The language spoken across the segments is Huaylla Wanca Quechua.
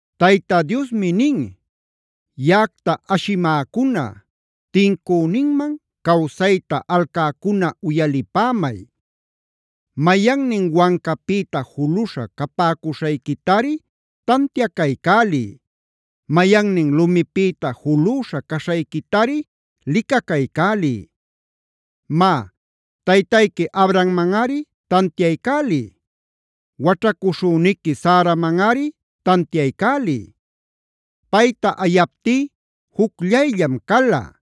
Tayta Diosmi nin: “Yaꞌacta ashimäcuna, tincüninman cawsayta alcäcuna uyalipämay. Mayannin wancapïta juluśha capäcuśhayquitari tantiacaycäliy; mayannin lumipïta julüśha caśhayquitari licacaycäliy. Má, taytayqui Abrahammanꞌari tantiaycäliy; waćhacuśhüniqui Saramanꞌari tantiaycäliy. Payta ayaptí jucllayllam cala;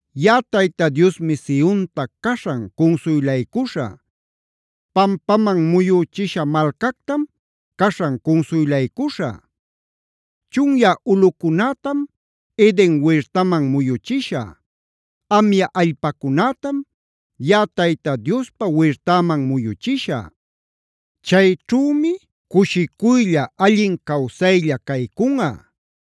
“Yaꞌa Tayta Diosmi Sionta caśhan cunsuylaycuśhä; pampaman muyüchisha malcactam caśhan cunsuylaycuśhä. Chunyä ulꞌucunätam Eden wirtaman muyuchishä; amya allpacunätam yaꞌa Tayta Diospa wirtäman muyuchishä. Chayćhümi cushicuylla, allin cawsaylla caycunꞌa;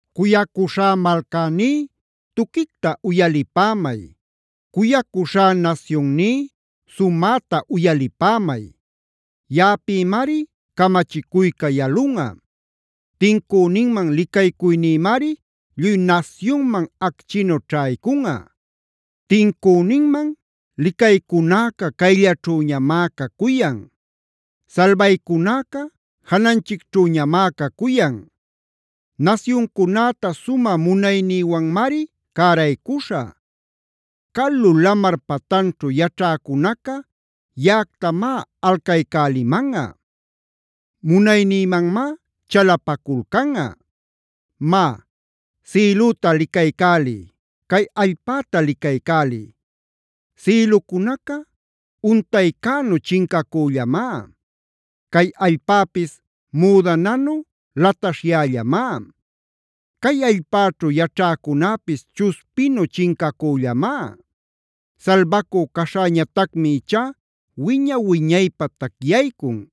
“Cuyacuśhá malcäní, tuquicta uyalipämay; cuyacuśhá nasyunní, sumäta uyalipämay. Yaꞌapïmari camachicuyca yalunꞌa; tincüninman licaycuynïmari lluy nasyunman acchinu ćhaycunꞌa. Tincüninman licaycunäca cayllaćhüñamá cacuyan; salbaycunäca jananchicćhüñamá cacuyan. Nasyuncunäta sumä munaynïwanmari cäraycuśhä. Calu lamar patanćhu yaćhäcunaca yaꞌactamá alcaycälimanꞌa; munaynïmanmá chalapaculcanꞌa. Má, sïlüta licaycäliy; cay allpäta licaycäliy. Sïlucunaca untaycänu chincacüllamá; cay allpäpis müdananu lataśhyällamá. Cay allpäćhu yaćhäcunäpis chuspinu chincacüllamá. Salbacü caśhäñatacmi ichá wiña-wiñaypä tacyaycun.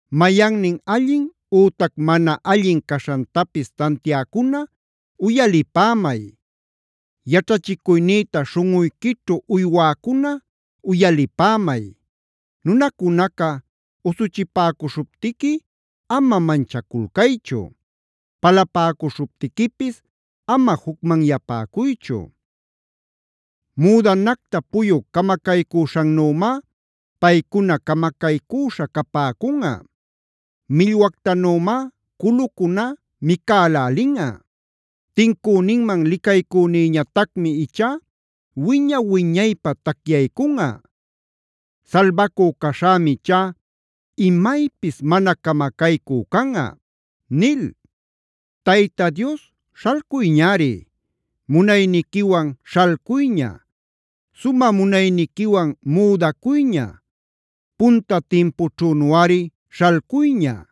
“Mayannin allin ütac mana allin caśhantapis tantiäcuna uyalipämay; yaćhachicuynïta śhunꞌuyquićhu uywäcuna uyalipämay. Nunacunaca usuchipäcuśhuptiqui ama manchaculcaychu; palapäcuśhuptiquipis ama jucmanyapäcuychu. Müdanacta puyu camacaycüśhannümá paycuna camacaycüśha capäcunꞌa; millwactanümá culucuna micalälinꞌa. Tincünïman licaycünïñatacmi ichá wiña-wiñaypä tacyaycunꞌa; salbacü caśhämi ichá imaypis mana camacaycü canꞌa” nil. ¡Tayta Dios śhalcuyñari! ¡Munayniquiwan śhalcuyña! Sumä munayniquiwan müdacuyña. Punta timpućhünuꞌari śhalcuyña.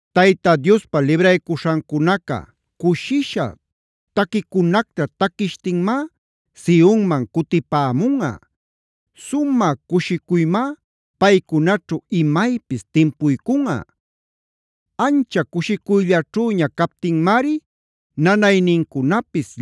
Tayta Diospa libraycuśhancunaca cushisha taquicunacta taquishtinmá Sionman cutipämunꞌa. Sumä cushicuymá paycunaćhu imaypis timpuycunꞌa. Ancha cushicuyllaćhüña captinmari nanaynincunapis,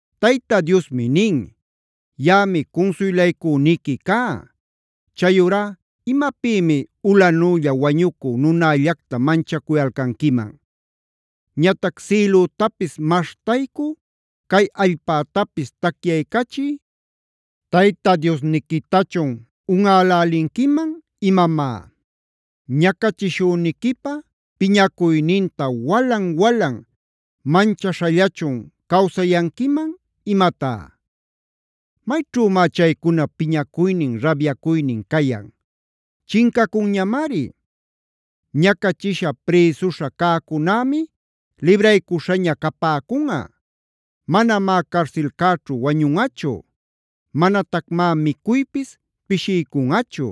Tayta Diosmi nin: “Yaꞌami cunsuylaycüniqui cá. Chayurá ¿imapïmi ulänülla wañucü nunällacta manchacuyalcanquiman? Ñatac ¿sïlütapis maśhtaycü, cay allpätapis tacyaycachï Tayta Diosniquitachun unꞌälälinquiman imamá? ¿Ñacachishüniquipa piñacuyninta walan-walan manchaśhallachun cawsayanquiman imatá? ¿Mayćhümá chaycunap piñacuynin rabyacuynin cayan? Chincacunñamari. Ñacachisha prïsuśha cäcunämi libraycuśhaña capäcunꞌa. Manamá carsilcäćhu wañunꞌachu; manatacmá micuypis pishiycunꞌachu.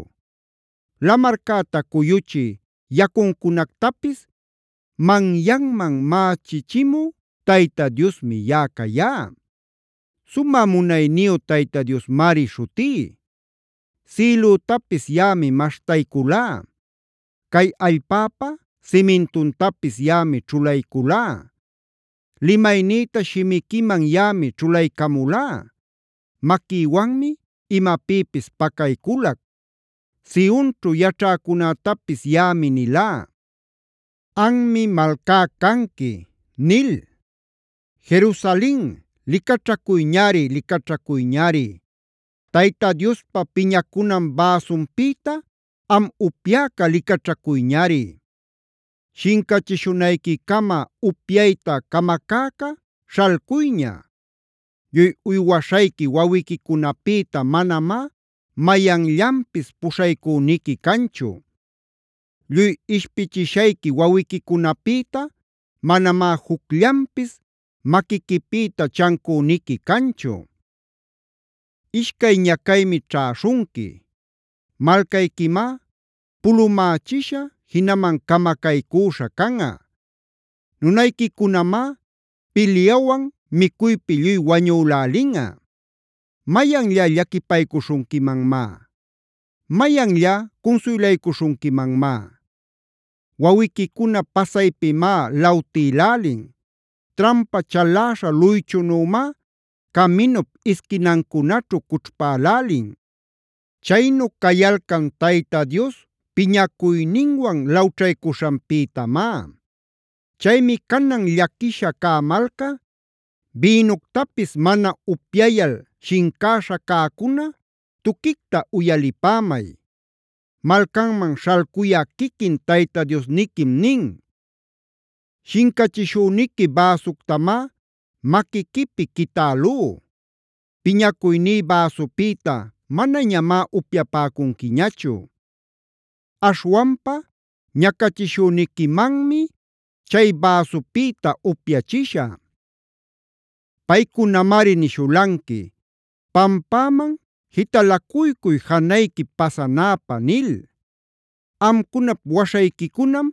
Lamarcäta cuyuchï yacuncunactapis manyanman mächichimü Tayta Diosmi yaꞌa cayá. Sumä munayniyu Tayta Diosmari śhutí. Sïlütapis yaꞌami maśhtayculá; cay allpäpa simintuntapis yaꞌami ćhulayculá. Limaynïta shimiquiman yaꞌami ćhulaycamulá; maquïwanmi imapïpis pacayculac. Sionćhu yaćhäcunätapis yaꞌami nilá: ‘Anmi malcá canqui’” nil. ¡Jerusalen, licaćhacuyñari, licaćhacuyñari! ¡Tayta Diospa piñacunan bäsunpïta am upyäca licaćhacuyñari!h Shincachishunayquicama upyayta camacäca śhalcuyña. Lluy uywaśhayqui wawiquicunapïta manamá mayanllanpis puśhaycüniqui canchu. Lluy ishpichishayqui wawiquicunapïta manamá jucllanpis maquiquipïta chancüniqui canchu. Ishcay ñacaymi ćhäśhunqui: Malcayquimá pulumächisha jinaman camacaycüśha canꞌa. Nunayquicunamá pilyawan micuypi lluy wañülälinꞌa. ¿Mayanllá llaquipaycuśhunquimanmá? ¿Mayanllá cunsuylaycuśhunquimanmá? Wawiquicuna pasaypimá lawtïlälin; trampa chaläśha luychunümá caminup isquinancunaćhu cućhpälälin. Chaynu cayalcan Tayta Dios piñacuyninwan lawćhaycuśhanpïtamá. Chaymi canan llaquisha cä malca, bïnuctapis mana upyayal shincäśha cäcuna tuquicta uyalipämay. Malcanman śhalcuyä quiquin Tayta Diosniquim nin: “Shincachishüniqui bäsuctamá maquiquipi quitälú. Piñacuyní bäsupïta manañamá upyapäcunquiñachu. Aśhwanpa ñacachishüniquimanmi chay bäsupïta upyachishä; paycunamari nishulanqui: ‘Pampäman jitalacuycuy janayquip pasanäpä’ nil. Amcunap waśhayquicunam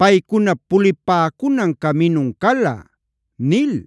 paycunap pulipäcunan caminun cala” nil.